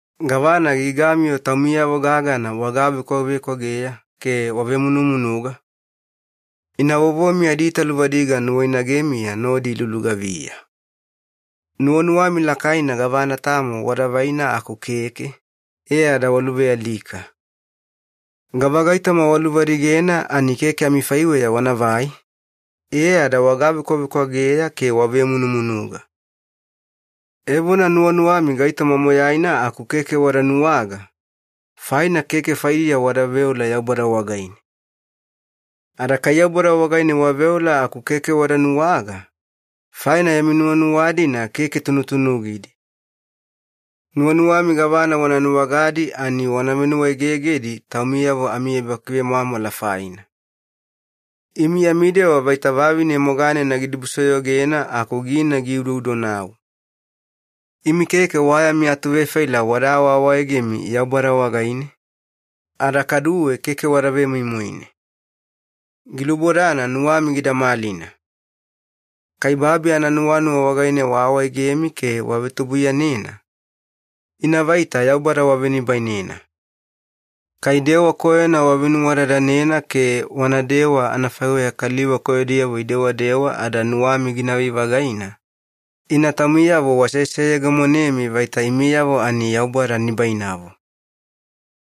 Gavana gigami-yo taumiyavo gagana wagavekwavekwageya ke wavemunumunuga? Ina vovomi adiitaluvadiga nuwainagemiya nodi ilulugaviya. Nuwanuwami lakaina gavana tamo wada vaina aku keke, e ada waluvealika. Gavagaitoma waluvadigena ani keke amifaiweya wanavai, e ada wagavekwavekwageya ke wavemunumunuga. Evona nuwanuwami gaitoma moyaina aku keke wada nuwaga, faina keke faidiya wada veola Yaubada wagaine. Ada kai Yaubada wagaine waveola aku keke wada nuwaga, faina yami nuwanuwa-dina keke tunutunugidi. Nuwanuwami gavana wana nuwagadi ani wana venuwaegegedi taumiyavo ami ebakivemwamwala faina. Imi yami dewa vaita vavine moganena gidibusoyogena aku gina giudoudonau. Imi keke wa yami atuvefaila wada awaawaegemi Yaubada wagaine, ada kaduwe keke wada vemoimoine. Gilubodana nuwami gida malina. Kai babi ananuwanuwa wagaine waawaegemi ke wavetubuiyanena, ina vaita Yaubada wavenibainena. Kai dewa koyona wavenuwadadanena ke wanadewa anafaiweya kaliva koyodiyavo idewadewa ada nuwami ginavai-vagaina, ina taumiyavo waseseyegemonemi vaita imiyavo ani Yaubada nibainavo.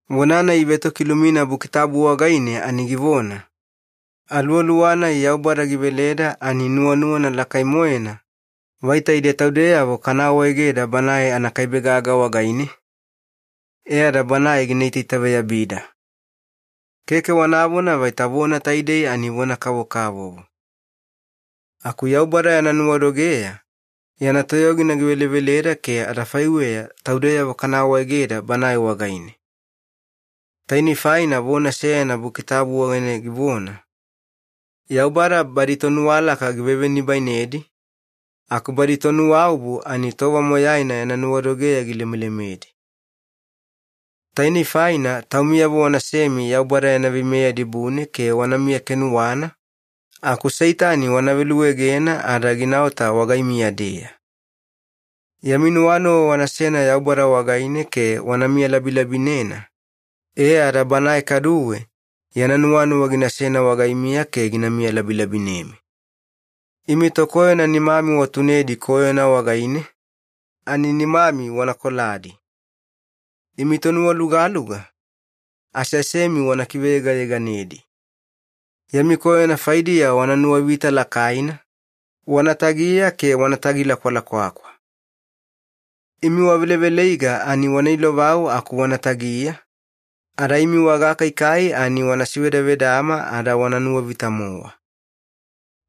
Vona-nai ivetokilumina Buki Tabu wagaine ani givona, “Aluwaluwa-nai Yaubada giveleda ani nuwanuwana lakai-moena vaita ide taudeyavo kana awaegeda Banae anakaibe gaga wagaine, e ada Banae gina itaitaveyabida.” Keke wanavona vaita vona taidei ani vona kavokavovo. Aku Yaubada yana nuwadogeya yana toyogina giveleveleda ke adafaiweya taudeyavo kana awaegeda Banae wagaine. Tainei faina vona seyana Buki Tabu wagaine givona, Yaubada badi tonuwalaka givevenibainedi, aku badi tonuwaobu ani tova moyaina yana nuwadogeya gilemelemedi. Tainei faina taumiyavo wanasemi Yaubada yana veimeya dibune ke wanamiya kenuwana, aku Seitani wana veluegena ada ginaota wagaimiya-deya. Yami nuwanuwa wanasena Yaubada wagaine ke wana miyalabilabinena, e ada Banae kaduwe yana nuwanuwa ginasena wagaimiya ke gina miyalabilabinemi. Imi tokoyona nimami watunedi koyona wagaine, ani nimami wana koladi. Imi tonuwalugaluga, aseasemi wana kiveyegayeganedi. Yami koyona faidiya wana nuwavita lakaina, wana tagiya ke wana tagilakwalakwakwa. Imi waveleveleiga ani wana ilovau aku wana tagiya, ada imi wagakaikai ani wana sivedavedama ada wana nuwavita-mowa.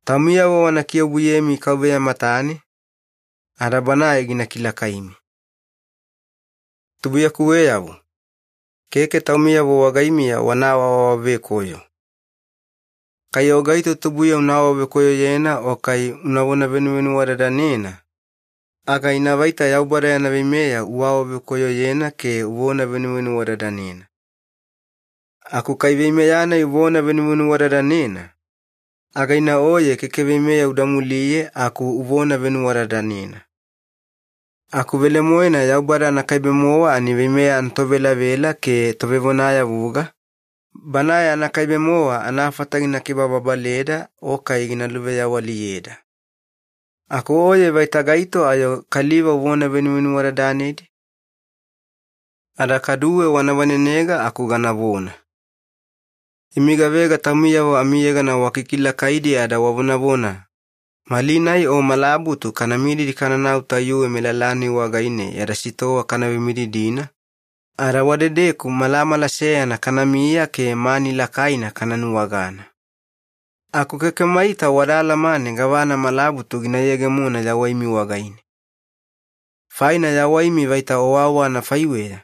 Taumiyavo wana kiobuyemi KAUVEYA matane, ada Banae gina kilakaimi. Tubuiyakuweyavo, keke taumiyavo wagaimiya wana awaawavekoyo. Kai o gaito tubuiya una awavekoyoyena o kai unavona venuvenuwadadanena, aga ina vaita Yaubada yana veimeya uawavekoyoyena ke uvona venuvenuwadadanena. Aku kai veimeya-nai uvona venuvenuwadadanena, aga ina oye keke veimeya uda muliye aku uvona venuwadadanena. Aku velemoena Yaubada anakaibe-mowa ani veimeya anatovelavela ke Tovevonayavuga, Banae anakaibe-mowa anafata gina kibababaleda o kai gina luveyawaliyeda. Aku oye vaita gaito ayo kaliva uvona venuvenuwadadanedi? Ada kaduwe wana vanenega aku ganavona. Imi gavega taumiyavo amiyegana wakikilakaidi ada wavonavona, “Malinai o malabutu kana mididi kananau tayuwe melala-nai wagaine yada sitowa kana vemididina, ada wadedeku malamala seyana kanamiya ke mani lakaina kana nuwagana.” Aku keke maita wada alamane gavana malabutu gina yegemona yawaimi wagaine. Faina yawaimi vaita owaowa anafaiweya.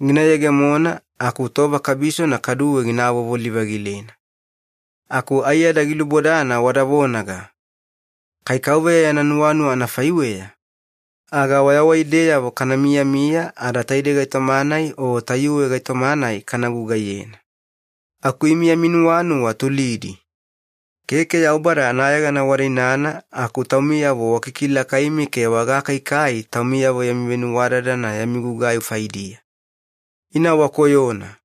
Gina yegemona aku tova kabisona kaduwe gina avovoli-vagilena. Aku aiyada gilubodana wada vonaga, “Kai KAUVEYA yana nuwanuwa anafaiweya, aga wayawaideyavo kana miyamiya ada taidei gaitoma-nai o tayuwe gaitoma-nai kana gugaiyena.” Aku imi yami nuwanuwa tulidi. Keke Yaubada anayegana wada inana aku taumiyavo wakikilakaimi ke wagakaikai taumiyavo yami venuwadadana yami gugai faidiya. Ina wakoyona.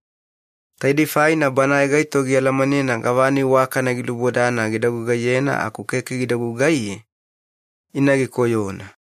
Taidei faina banae gaito gialamanena gavana iwakana gilubodana gida gugaiyena aku keke gida gugaiye, ina gikoyona.